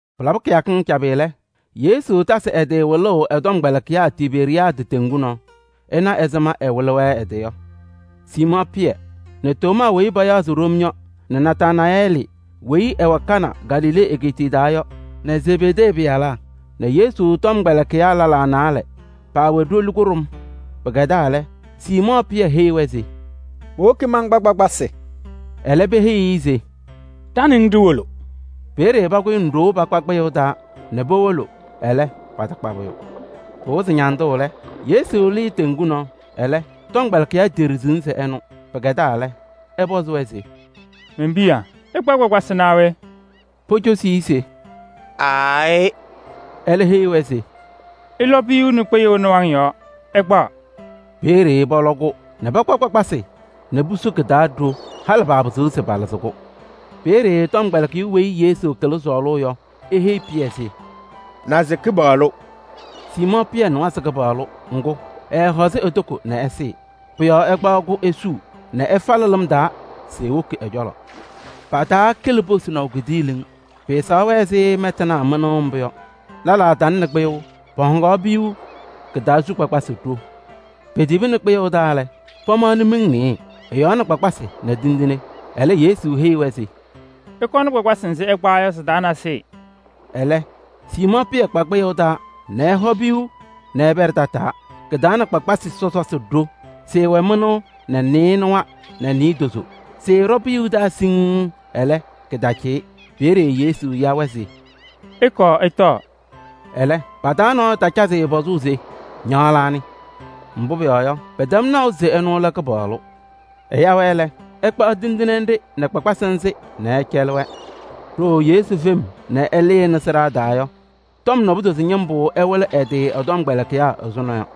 Pɩlabɩ kɩyakɩŋ cabɩ lɛ, Yesu tasɩ ɛ-tɩ wɩlʋʋ ɛ-tɔmkpɛlɩkɩyaa Tiberiyaadɩ teŋgu nɔɔ. Ɩnaɣ ɛzɩma mbʋ ɛwɩlɩ-wɛ ɛ-tɩ yɔ: Siimɔɔ Pɩyɛ nɛ Tomaa weyi payaɣ se Ɖom yɔ nɛ Nataanayɛɛlɩ weyi ɛwɛ Kana Galilee egeetiye taa yɔ nɛ Zebedee pɩyalaa nɛ Yesu tɔmkpɛlɩkɩyaa lɛlaa naalɛ, paawɛ ɖoli kʋɖʋm. Pɩkɛdaa lɛ, Siimɔɔ Pɩyɛ heyi-wɛ se: “Mowoki mankpa kpakpasɩ.” Ɛlɛ peheyi-i se: “Ɖa nɛ ŋ ɖiwolo.” Peeye pakʋyɩnɩ ɖoo pakpa kpɩyʋʋ taa nɛ powolo, ɛlɛ, patakpa pʋyʋ. Pɩwɩzɩ ñandʋʋ lɛ, Yesu lɩɩ teŋgu nɔɔ. Ɛlɛ, tɔmkpɛlɩkɩyaa teɖiɣzini se ɛnʋ. Pɩkɛdaa lɛ, ɛpɔzɩ-wɛ se: “Men-piya! Ɩkpa kpakpasɩ naa we?” Pocosi-i se: “Aayɩ.” Ɛlɛ eheyi-wɛ se: “Ɩlɔ piyuu nɛ kpɩyʋʋ nɩwaŋ yɔɔ, ɩkpaɣ.” Peeye pɔlɔ-kʋ nɛ pakpa kpakpasɩ nɛ pusu kɩ-taa ɖo, halɩ paapɩzɩɣ se palɩzɩ-kʋ. Peeye tɔmkpɛlɩkɩyʋ weyi Yesu kɩlɩ sɔɔlʋʋ yɔ, eheyi Pɩyɛ se: “Naze Kɩpaɣlʋ!” Siimɔɔ Pɩyɛ nɩwa se Kɩpaɣlʋ, ŋgʋ, ɛɛhɔzɩ e-toko nɛ ɛsɩɩ. Pʋ-yɔɔ ɛkpaɣ-kʋ esuu nɛ ɛfalɩ lɩm taa se ewoki ɛ-cɔlɔ. Pataakɩlɩ posinaʋ kidiiliŋ, pɩɩsɛɣ-wɛ ɛzɩ mɛtanaa mɩnʋʋ mbʋ yɔ. Pʋ-yɔɔ lɛlaa talɩnɩ kpɩyʋʋ, pɔhɔŋaɣ piyuu, kɩ-taa su kpakpasɩ ɖo. Petibini kpɩyʋʋ taa lɛ, pamaɣnɩ miŋ nɩɩyɩ, ɛ-yɔɔ nɛ kpakpasɩ nɛ tindine. Ɛlɛ Yesu heyi-wɛ se: “Ɩkɔnɩ kpakpasɩ nzɩ ɩkpawa yɔ sɩ-taa nasɩyɩ.” Ɛlɛ Siimɔɔ Pɩyɛ kpa kpɩyʋʋ taa nɛ ɛhɔ piyuu nɛ ɛpɛɖɩ tataa, kɩ-taa nɛ kpakpasɩ sɔsɔsɩ ɖo: sɩɩwɛ mɩnʋʋ nɛ nɩɩnʋwa nɛ naadozo. Sɩɩɖɔ piyuu taa siŋŋ, ɛlɛ, kɩtacɩyɩ. Peeye Yesu ya-wɛ se: “Ɩkɔɔ ɩtɔɔ.” Ɛlɛ, pa-taa nɔɔyʋ taacazɩ-ɩ pɔzʋʋ se: “Ña anɩ?” Mbʋ pʋyɔɔ yɔ, paatɛm naʋ se ɛnʋ lɛ Kɩpaɣlʋ. Ɛya-wɛ lɛ, ɛkpaɣ tindine nɖɩ nɛ kpakpasɩ nzɩ nɛ ɛcɛlɩ-wɛ. Ɖooo Yesu fem nɛ ɛlɩnɩ sɩɖaa taa yɔ, tɔm naadozo ñɩmbʋ ɛwɩlɩ ɛ-tɩ ɛ-tɔmkpɛlɩkɩyaa ɛzʋnɔ yɔ.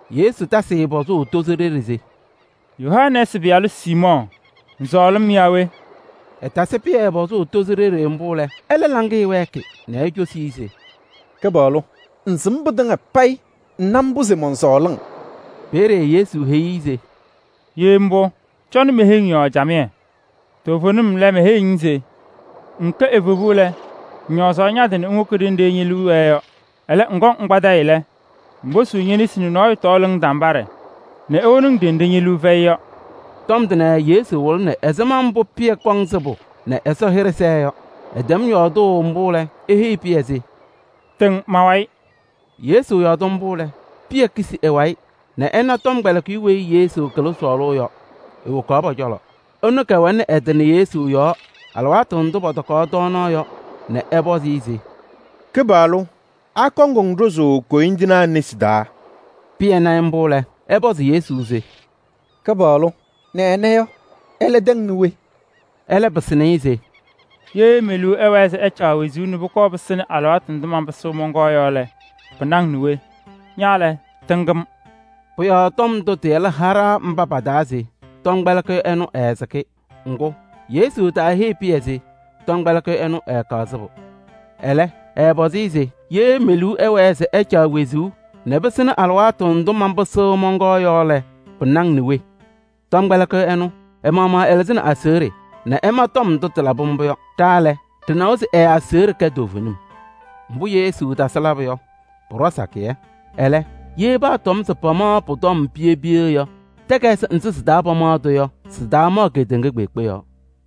Yesu tasɩ-ɩ pɔzʋʋ tozo ɖeɖe se: “Yohanɛɛsɩ pɩyalʋ Siimɔɔ! Ŋsɔɔlɩ-m yaa we?” Ɛtasɩ Pɩyɛ pɔzʋʋ tozo ɖeɖe mbʋ lɛ, ɛlɛ laŋɩyɛ wɛɛkɩ nɛ ecosi-i se: “Kɩpaɣlʋ! Ŋsɩm pɩtɩŋa payɩ. Ŋna mbʋ se mɔnsɔɔlɩ-ŋ!” Peeye Yesu heyi-i se: “Ye mbʋ, cɔnɩ me-heŋ yɔɔ camɩyɛ.” Toovenim lɛ, meheyiɣ-ŋ se: “Ŋŋkɛ evebu lɛ, ŋñɔɔzaɣ ña-tɩ nɛ ŋwoki ɖenɖe ñe-liu wɛɛ yɔ. Ɛlɛ, ŋkɔŋ ŋkpadɩyɩ lɛ, ŋposuu ñe-nesi nɛ nɔɔyʋ tɔɔlɩ-ŋ tambaɖɛ nɛ ewoni-ŋ ɖenɖe ñe-liu fɛyɩ yɔ.” Tɔm tʋnɛ Yesu wɩlɩnɩ ɛzɩma mbʋ Pɩyɛ kɔŋ sɩbʋ nɛ Ɛsɔ hɩɖɛ sɛɛ yɔ. Ɛtɛm yɔɔdʋʋ mbʋ lɛ, eheyi Pɩyɛ se: “Tɩŋ ma-wayɩ.” Yesu yɔɔdɩ mbʋ lɛ, Pɩyɛ kisi ɛ-wayɩ nɛ ɛna tɔmkpɛlɩkɩyʋ weyi Yesu kɩlɩ sɔɔlʋʋ yɔ, ewokaɣ pɔ-cɔlɔ. Ɛnʋ kɛwɛlɩnɩ ɛ-tɩ nɛ Yesu yɔɔ alɩwaatʋ ndʋ pɔtɔkaɣ tɔɔnaɣ yɔ nɛ ɛpɔzɩ-ɩ se: “Kɩpaɣlʋ! Akɔŋ-ŋ ɖʋzʋʋ koyindinaa nesi taa?” Pɩyɛ na-ɩ mbʋ lɛ, ɛpɔzɩ Yesu se: “Kɩpaɣlʋ! Nɛ ɛnɛ yɔ, ɛlɛ tɛŋnɩ we?” Ɛlɛ pɩsɩnɩ-ɩ se: “Ye me-liu ɛwɛɛ se ɛcaɣ wezuu nɛ pɩsɩnɩ alɩwaatʋ ndʋ manpɩsɩɣ mɔnkɔɔ yɔ lɛ, pɩna-ŋ nɛ we? Ña lɛ, tɩŋ-m!” Pʋ-yɔɔ tɔm ndʋ tɩcɔ taabalaa cɔlɔ se tɔmkpɛlɩkɩyʋ ɛnʋ ɛɛsɩkɩ. Ŋgʋ, Yesu taaheyi Pɩyɛ se: “Tɔmkpɛlɩkɩyʋ ɛnʋ ɛɛkaɣ sɩbʋ.” Ɛlɛ, ɛɛpɔzɩ-ɩ se: “Ye me-liu ɛwɛɛ se ɛcaɣ wezuu nɛ pɩsɩnɩ alɩwaatʋ ndʋ manpɩsɩɣ mɔnkɔɔ yɔ lɛ, pɩna-ŋ nɛ we?” Tɔmkpɛlɩkɩyʋ ɛnʋ, ɛ-maɣmaɣ ɛlɩzɩnɩ aseɣɖe nɛ ɛma tɔm ndʋ tɩlabɩ mbʋ yɔ. Ɖa lɛ, ɖɩnawa se ɛ-aseɣɖe kɛ toovenim. Mbʋ Yesu tasɩ labʋ yɔ, pʋɖɔ sakɩyɛ. Ɛlɛ, ye paatɔm se pamaɣ pʋ-tɔm piye piye yɔ, takayɩsɩ nzɩ sɩ-taa pamaɣ-tʋ yɔ, sɩtaamaɣ kedeŋa kpeekpe yɔɔ.